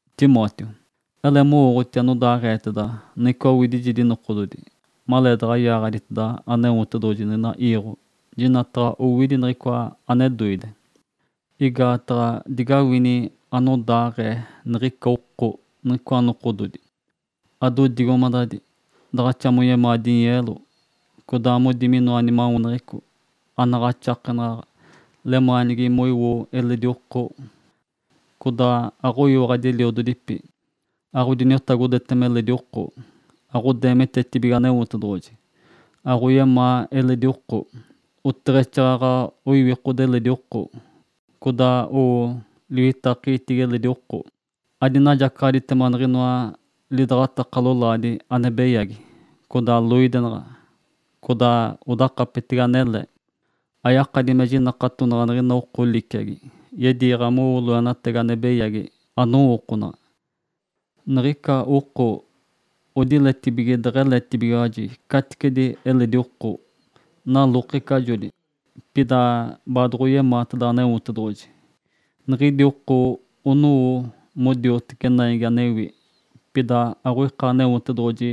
Timóteo, ele mowooɡ̶oti anodaaɡ̶eeteda niɡ̶icoa owidijedi nokododi, maleedaɡ̶a yaaɡ̶aditeda Aneotedoɡ̶oji niɡ̶ina iiɡ̶o, jinataɡ̶a owidi niɡ̶icoa ane doide. Igaataɡ̶a digawini anodaaɡ̶ee niɡ̶ica oko niɡ̶icoa nokododi: Adodigomadadi, daɡ̶axa moyemaa dinyeelo, codaa modi minoa nimaweneɡ̶eco, anaɡ̶axakenaɡ̶aɡ̶a, lemaanigi moiwo eledi oko. Codaa aɡ̶oyiwaɡ̶adi eliododipi, aɡ̶odiniotagodetema eledi oko, aɡ̶odeemitetibige Aneotedoɡ̶oji, aɡ̶oyemaa eledi oko, oteɡ̶exaaɡ̶aɡ̶a oiwikode eledi oko. Codaa owo liwitakegitigi eledi oko, adinajacaɡ̶aditema niɡ̶inoa lidaɡ̶ataka lolaadi ane beyagi, codaa loidenaɡ̶a, codaa odakapetege anele. Ayakadi me jinakatonaɡ̶a niɡ̶ina oko liciagi, yediiɡ̶a mowo loenatagi ane beyagi anowookonaɡ̶a. Niɡ̶ica oko odiletibige deɡ̶eletibigiwaji caticedi eledi oko, nalokecajoli, pida baadoɡ̶oyemaateda Aneotedoɡ̶oji. Niɡ̶idi oko onowo modioteci naigi anewi, pida aɡ̶oika Aneotedoɡ̶oji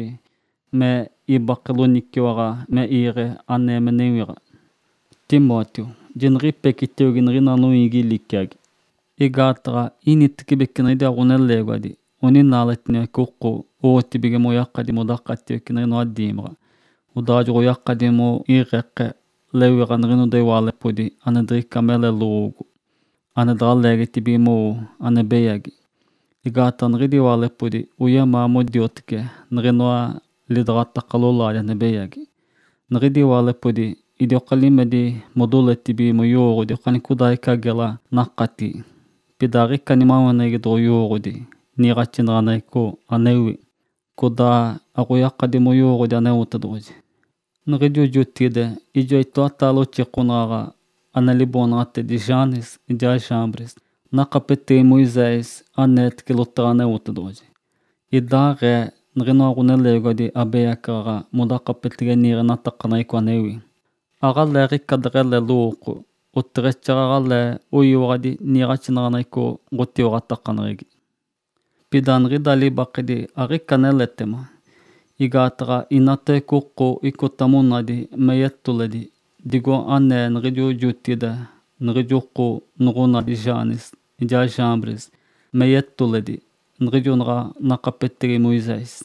me ibake loniciwaɡ̶a me iigi anee me newiɡ̶a. Timóteo, jiniɡ̶ipecitiogi niɡ̶ina noiigi liciagi. Igaataɡ̶a initibece niɡ̶idiwa ɡ̶oneleegiwadi oninaaletiniwace oko owotibige moyakadi modakatiwece niɡ̶inoa diimaɡ̶a. Odaa joɡ̶oyakadi moiiɡ̶e lewiɡ̶a niɡ̶inoda iwaalepodi ane diɡ̶ica mele lowoogo, ane daɡ̶a leegitibige mowo ane beyagi. Igaataɡ̶a niɡ̶idi iwaalepodi oyemaa modioteci niɡ̶inoa lidaɡ̶ataka lolaadi ane beyagi. Niɡ̶idi iwaalepodi idioka limedi modoletibige moyowooɡ̶odi okanicodaaɡ̶ica gela nakatigi, pida aɡ̶ica nimaweneɡ̶egi doɡ̶oyowooɡ̶odi niiɡ̶axinaɡ̶aneɡ̶eco anewi, codaa aɡ̶oyakadi moyowooɡ̶odi Aneotedoɡ̶oji. Niɡ̶ijo jotigide ijoa itoataale oxikonaɡ̶aɡ̶a ane liboonaɡ̶atedi Janes ijaa Jambres nakapetegi Moisés aneetece lotaɡ̶a Aneotedoɡ̶oji. Idaaɡ̶ee niɡ̶inoa ɡ̶oneleegiwadi abeyacaɡ̶aɡ̶a modakapetege niiɡ̶axinaɡ̶aneɡ̶eco anewi. Aɡ̶aleeɡ̶ica deɡ̶ele lowooko, oteɡ̶exaaɡ̶aɡ̶alee oyiwaɡ̶adi niiɡ̶axinaɡ̶aneɡ̶eco ɡ̶otiwaɡ̶atakaneɡ̶egi. Pida niɡ̶ida libakedi aɡ̶ica aneletema, igaataɡ̶a inatawece oko icota monadi me yetoledi, digo anee niɡ̶ijo jotigide niɡ̶ijo oko noɡ̶onadi Janes ijaa Jambres me yetoledi niɡ̶ijo naɡ̶a nakapetegi Moisés.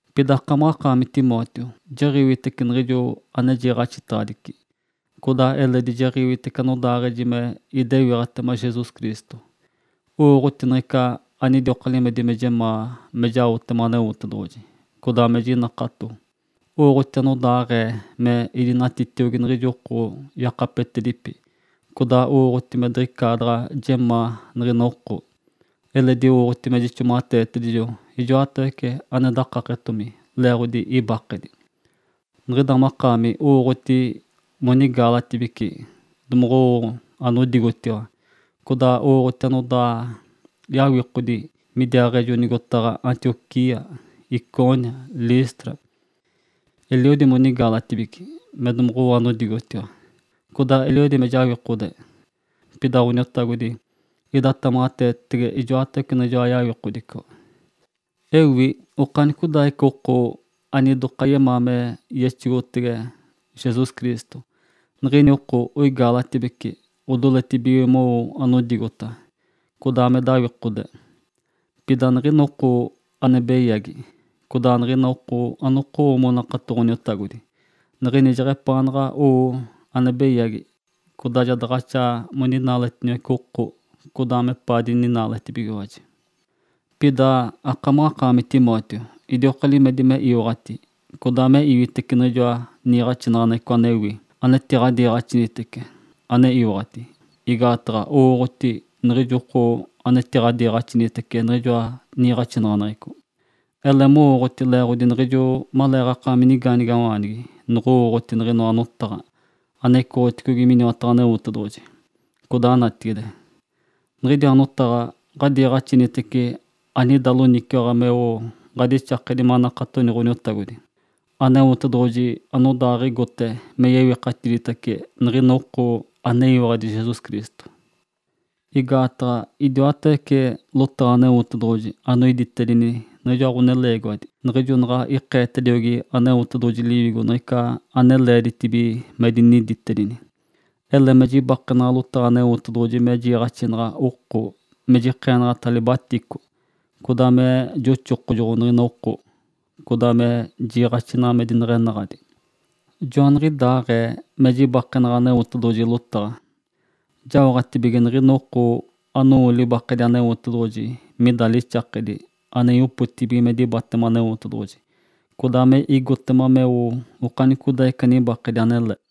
Pida akamaɡ̶akaami Timóteo jiɡ̶iwitece niɡ̶ijo ane jiiɡ̶axitaɡ̶adici, codaa eledi jiɡ̶iwitece anodaaɡ̶eji me idewiɡ̶atema Jesus Cristo, owooɡ̶oti niɡ̶ica anidioka limedi me jemaa me jaotema Aneotedoɡ̶oji, codaa me jinakato, owooɡ̶oti anodaaɡ̶ee me idinatitiogi niɡ̶ijo oko yakapetedipi, codaa owooɡ̶oti me diɡ̶icaadaɡ̶a jemaa niɡ̶ina oko, eledi owooɡ̶oti me jixomaɡ̶ateetedijo ijoatawece ane dakaketomi leeɡ̶odi ibakedi. Niɡ̶ida makaami owooɡ̶oti monigaalatibici domoɡ̶owo anodigotiwa, codaa owooɡ̶oti anodaa yawikodigi midiwa nigotadi Antioquia, Icônio, Listra. Eliodi monigaalatibici me domoɡ̶owo anodigotiwa, codaa eliodi me jawikode. Pida Ǥoniotagodi idatamaɡ̶ateetetege ijoatawece niɡ̶ijoa yawikodico. Ewi okanicodaaɡ̶ica oko anidoka yemaa me yewiɡ̶a me yexogotege Jesus Cristo, niɡ̶ini oko oigaalatibece odoletibige mowo anodigota, codaa me dawikode. Pida niɡ̶ina oko ane beyagi, codaa niɡ̶ina oko anokowo monakato Ǥoniotagodi, niɡ̶idi jeɡ̶epaanaɡ̶a owo ane beyagi. Codaa ja daɡ̶axa moninaaletiniwace oko, codaa mepaa dininaaletibigiwaji. Pida akamaɡ̶akaami Timóteo idioka limedi me iwaɡ̶ati codaa me iwitece niɡ̶ijoa niiɡ̶axinaɡ̶aneɡ̶eco anewi anadiniiɡ̶axinitece, ane iwaɡ̶ati, igaataɡ̶a owooɡ̶oti niɡ̶ijo oko anetiɡ̶adiiɡ̶axinitece niɡ̶ijoa niiɡ̶axinaɡ̶aneɡ̶eco. Ele mowooɡ̶oti leeɡ̶odi niɡ̶ijo maleeɡ̶akaami nigaanigawaanigi noɡ̶owooɡ̶oti niɡ̶inoa notaɡ̶a ane icoɡ̶otedigi miniwataɡ̶a Aneotedoɡ̶oji, codaa natigide. Niɡ̶idiwa notaɡ̶a ɡ̶adiiɡ̶axinitece, anida loniciwaɡ̶a meo ɡ̶adixakedi manakatoni Ǥoniotagodi. Aneotedoɡ̶oji anodaaɡ̶igote me yewikatiditace niɡ̶ina oko aneyiwaɡ̶adi Jesus Cristo. Igaataɡ̶a idiwatawece lotaɡ̶a Aneotedoɡ̶oji anoiditedini niɡ̶ijoa ɡ̶oneleegiwadi niɡ̶ijo naɡ̶a ikeetediogi Aneotedoɡ̶oji Liwigo niɡ̶ica ane leeditibige moiditedini. Ele me jibakenaɡ̶a lotaɡ̶a Aneotedoɡ̶oji me jiiɡ̶axinaɡ̶a oko me jikeenaɡ̶ata libatico, codaa me joxokojoɡ̶o niɡ̶ina oko, codaa me jiiɡ̶axinaɡ̶a me dineɡ̶enaɡ̶adi. Joaniɡ̶idaaɡ̶ee me jibakenaɡ̶a Aneotedoɡ̶oji lotaɡ̶a, jaoɡ̶atibige niɡ̶ina oko anowo libakedi Aneotedoɡ̶oji mida lixakedi ane yopotigi me dibatema Aneotedoɡ̶oji, codaa me igotema meo okanicodaaɡ̶ica nibakedi anele.